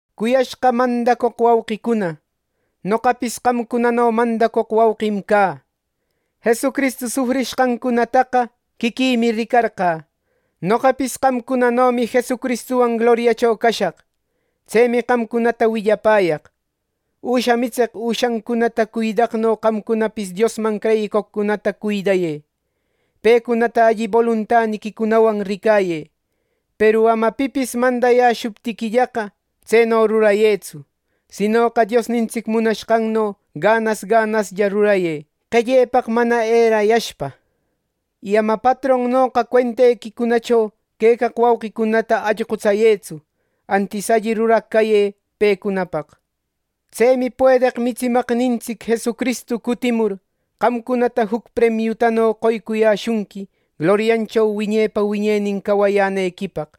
Cuyashqa mandacoq wauqicuna, noqapis qamcunano mandacoq wauqim cä. Jesucristu sufrishqancunataqa quiquïmi ricarqä. Noqapis qamcunanomi Jesucristuwan gloriacho cashaq. Tsemi qamcunata willapäyaq. Üsha mitseq üshancunata cuidaqno qamcunapis Diosman creyicoqcunata cuidayë. Pecunata alli boluntaniquicunawan ricayë. Peru ama pipis mandayäshuptiquillaqa, tseno rurayëtsu; sinoqa Diosnintsic munashqanno ganas ganaslla rurayë, qellepaq mana erayashpa. Y ama patronnoqa cuentequicunacho quecaq wauqicunata allqutsayëtsu; antis alli ruraq cayë pecunapaq. Tsemi puedeq mitsimaqnintsic Jesucristu cutimur, qamcunata juc premiutano qoycuyäshunqui gloriancho wiñepa wiñenin cawayänequipaq.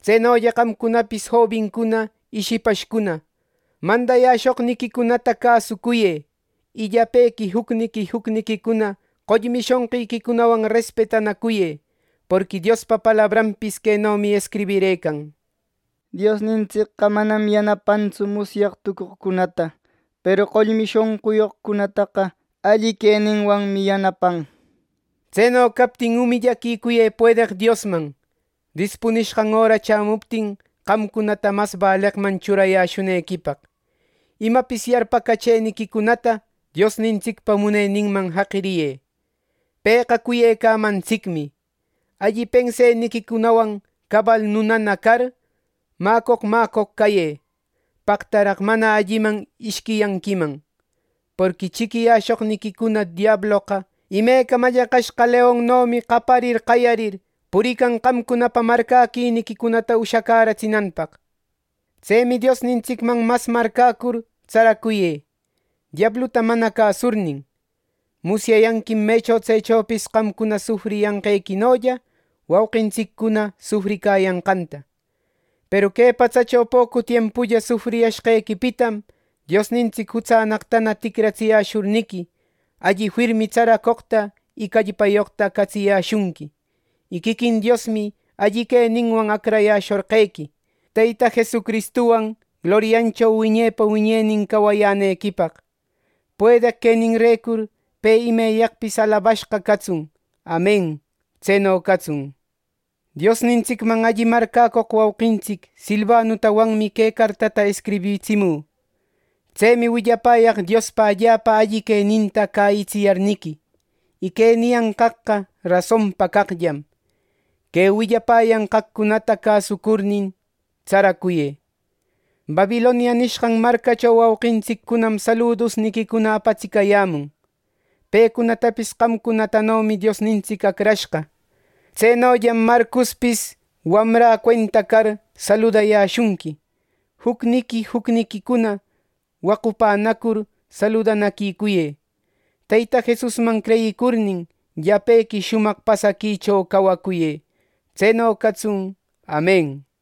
Tsenolla qamcunapis jobincuna y shipashcuna, mandayäshoqniquicunata cäsucuyë. Y llapequi jucniqui jucniquicuna qollmi shonqiquicunawan respetanacuyë. Porqui Diospa palabranpis quenomi escribirëcan: “Diosnintsicqa manam yanapantsu musyaq tucoqcunata; peru qollmi shonquyoqcunataqa alli queninwanmi yanapan” nir. Tseno captin umillaquicuyë puedeq Diosman, dispunishqan öra chämuptin qamcunata mas baleqman churayäshunequipaq. Imapis yarpacachëniquicunata Diosnintsicpa muneninman jaqiriyë. Pëqa cuyecamantsicmi. Alli penseniquicunawan cabal nunana car, mäcoq mäcoq cayë. ¡Paqtaraq, mana alliman ishquiyanquiman! Porqui chiquiyäshoqniquicuna diabloqa, imeca mallaqashqa leonnomi qaparir qayarir, purican qamcunapa marcäquiniquicunata ushacäratsinanpaq. Tsemi Diosnintsicman mas marcäcur tsaracuyë, diabluta mana cäsurnin. Musyayanquim mecho tsechopis qamcuna sufriyanqequinolla wauqintsiccuna sufricayanqanta. Peru que patsacho pocu tiempulla sufriyashqequipitam Diosnintsic jutsannaqtana ticratsiyäshurniqui, alli firmi tsaracoqta y callpayoqta catsiyäshunqui. Y quiquin Diosmi alli queninwan acrayäshorqequi, Teyta Jesucristuwan gloriancho wiñepa wiñenin cayänequipaq. ¡Puedeq queninrecur pe imeyaqpis alabashqa catsun! ¡Amen! ¡Tseno catsun! Diosnintsicman alli marcäcoq wauqintsic Silvanutawanmi que cartata escribitsimü. Tsemi willapäyaq Diospa allapa alli queninta cäyitsiyarniqui. Y que niyanqaqqa rasonpa caqllam. Que willapäyanqaqcunata cäsucurnin tsaracuyë. Babilonia nishqan marcacho wauqintsiccunam saludusniquicuna apatsicayämun. Pecunatapis qamcunatanomi Diosnintsic acrashqa. Tsenollam Marcospis, wamrä cuenta car, saludayäshunqui. Jucniqui jucniquicuna waqupänacur saludanaquicuyë. Teyta Jesusman creyicurnin, llapequi shumaq pasaquicho cawacuyë. ˻Tseno catsun. Amen.˼